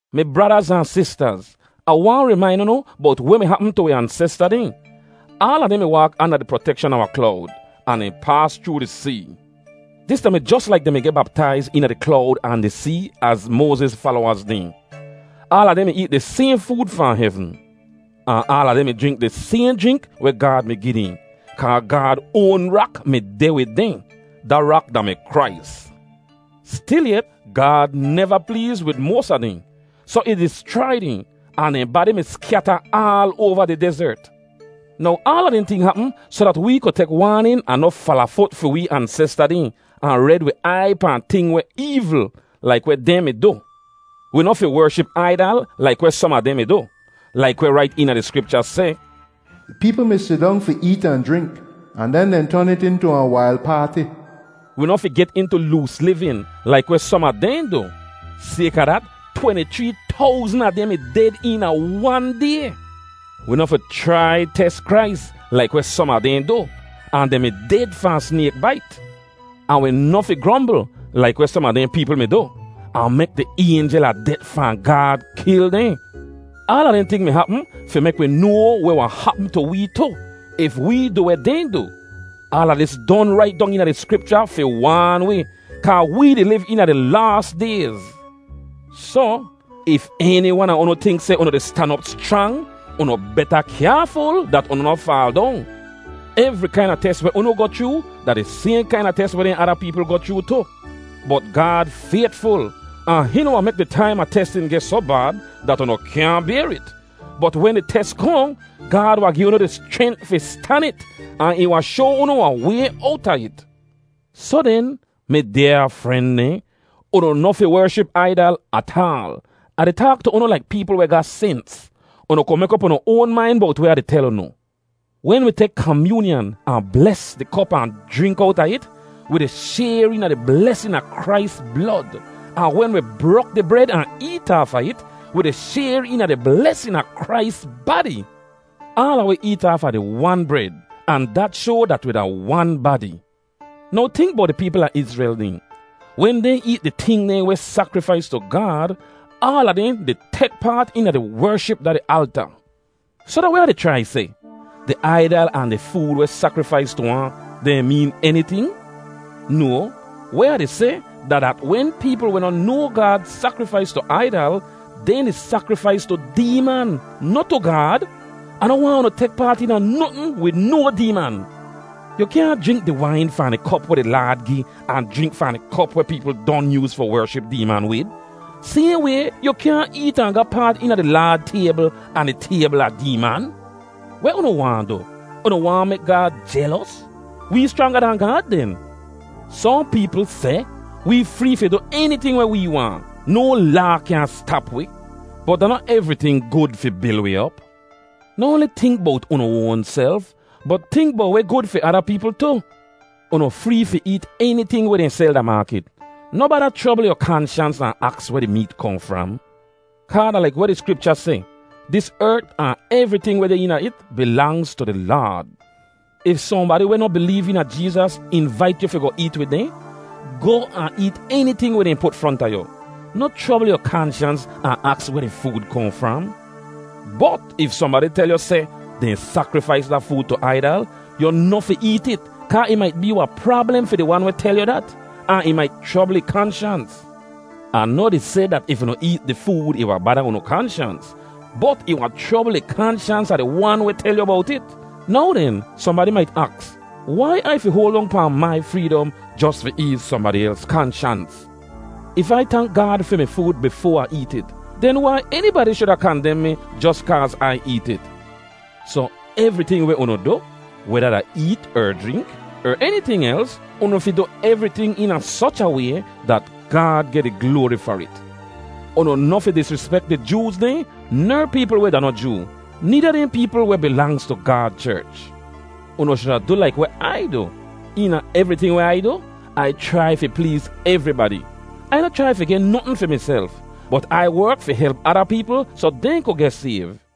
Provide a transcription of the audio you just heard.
Mi bradaz ahn sistaz, Ah waahn rimain unu bowt weh mi hapm tu wi ansesta dehn. Aala dehn mi waak anda di protekshan a wahn klowd ahn dehn paas chroo di see. Dis da-mi jos laik dehn mi geh baptaiz eena di klowd ahn di see az Moaziz falowaz dehn. Aala dehn mi eet di sayhn food fahn hevn. Ahn aala dehn mi jrink di sayhn jrink weh Gaad mi gi dehn, kaa Gaad oan rak mi deh wid dehn. Da rak da-mi Krais. Stilyet, Gaad neva pleez wid moas a dehn, soh ih dischrai dehn, ahn dehn badi mi skyata aal oava di dezert. Now aala dehn ting hapm soh dat wee ku tek waanin ahn noh falafut fi wee ansesta dehn, ahn red wi aiy pahn ting weh eevl, laik weh dehn mi du. Wi noh fi wership aidal laik weh som a dehn mi du. Laik weh rait eena di Skripcha seh, “Di peepl mi sidong fi eet ahn jrink, ahn den dehn ton it intu wahn wail paati.” Wi noh fi get intu loos livin, laik weh som a dehn du. Sayka dat, tweni-chree towzn a dehn mi ded eena wan day. Wi noh fi chrai tes Krais, laik weh som a dehn du, ahn dehn mi ded fahn snayk bait. Ahn wi noh fi grombl, laik weh som a dehn peepl mi du, ahn mek di Aynjel a Det fahn Gaad kil dehn. Aala dehn ting mi hapm fi mek wi noa weh wahn hapm tu wee tu, if wee du weh dehn du. Aala dis don rait dong eena di Skripcha fi waan wi, kaa wee di liv eena di laas dayz. Soh, if eni wan a unu tink seh unu di stan op schrang, unu beta kyaaful dat unu noh faal dong. Evri kaina tes weh unu goh chroo da di sayhn kaina tes dehn weh ada peepl goh chroo tu. Bot Gaad faytful, ahn hihn noh wahn mek di taim a testin geh soh bad dat unu kyaahn bayr it. Bot wen di tes kohn, Gaad wahn gi unu di schrent fi stan it, ahn ih wahn shoa unu wahn way owta it. Soh den, mi dyaa fren dehn, unu noh fi wership aidal ataal. Ah di taak tu unu laik peepl weh ga sens. Unu ku mek op unu oan main bowt weh Ah di tel unu. Wen wi tek kamyoonyan ahn bles di kop ahn jrink owta it, wi di shayr eena di blesin a Krais blod. Ahn wen wi brok di bred ahn eet aafa it, wi di shayr eena di blesin a Krais badi. Aala wi eet aafa di wan bred, ahn dat shoa dat wi da wan badi. Now tink bowt di peepl a Izrel dehn: Wen dehn eet di ting dehn weh sakrifais tu Gaad, aala dehn di tek paat eena di wership da di alta. Soh da weh Ah di chrai seh? Di aidal ahn di food weh sakrifais tu ahn, dehn meen eniting? No, weh Ah di seh da dat wen peepl weh noh noa Gaad sakrifais tu aidal, dehn di sakrifais tu deeman, noh tu Gaad. Ah noh waahn unu tek paat eena notn wid no deeman. Yu kyaahn jrink di wain fahn di kop weh di Laad gi ahn jrink fahn di kop weh peepl don yooz fi wership deeman wid. Sayhn way, yu kyaahn eet ahn ga paat eena di Laad taybl ahn di taybl a deeman. Weh unu waahn du? Unu waahn mek Gaad jelos? Wee schranga dahn Gaad den? Sohn peepl seh, “Wee free fi du eniting weh wee waahn. No laa kyaahn stap wi.” Bot da noh evriting gud fi bil wi op. Noh oanli tink bowt unu oanself, bot tink bowt weh gud fi ada peepl tu. Unu free fi eet eniting weh dehn sel da maakit. Noh bada chrobl yu kanshans ahn aks weh di meet kohn fram. Kaa da laik weh di Skripcha seh, “Dis ert ahn evriting weh deh eena it bilangz tu di Laad.” If sohnbadi weh noh bileev eena Jeezas invait yu fi goh eet wid dehn, goh ahn eet eniting weh dehn put fronta yu. Noh chrobl yu kanshans ahn aks weh di food kohn fram. Bot if sohnbadi tel yu seh, “Dehn sakrifais da food tu aidal,” yu noh fi eet it kaa ih mait bee wahn prablem fi di wan weh tel yu dat, ahn ih mait chrobl ih kanshans. Ah noh di seh dat if unu eet di food ih wahn bada unu kanshans. Bot ih wahn chrobl di kanshans a di wan weh tel yu bowt it. Now den, sohnbadi mait aks wai Ai fi hoal dong pahn mai freedom jos fi eez sohnbadi els kanshans? If Ai tank Gaad fi mi food bifoa Ah eet it, den wai enibadi shuda kandem mi jos kaaz Ai eet it? Soh, evriting weh unu du, weda da eet er jrink, er eniting els, unu fi du evriting eena soch a way dat Gaad geh di gloari far it. Unu noh fi disrispek di Jooz dehn ner peepl weh da noh Joo, needa dehn peepl weh bilangz tu Gaad cherch. Unu shuda du laik weh Ai du. Eena evriting weh Ai du, Ai chrai fi pleez evribadi. Ai noh chrai fi geh notn fi miself, bot Ai werk fi help ada peepl soh dehn ku geh sayv.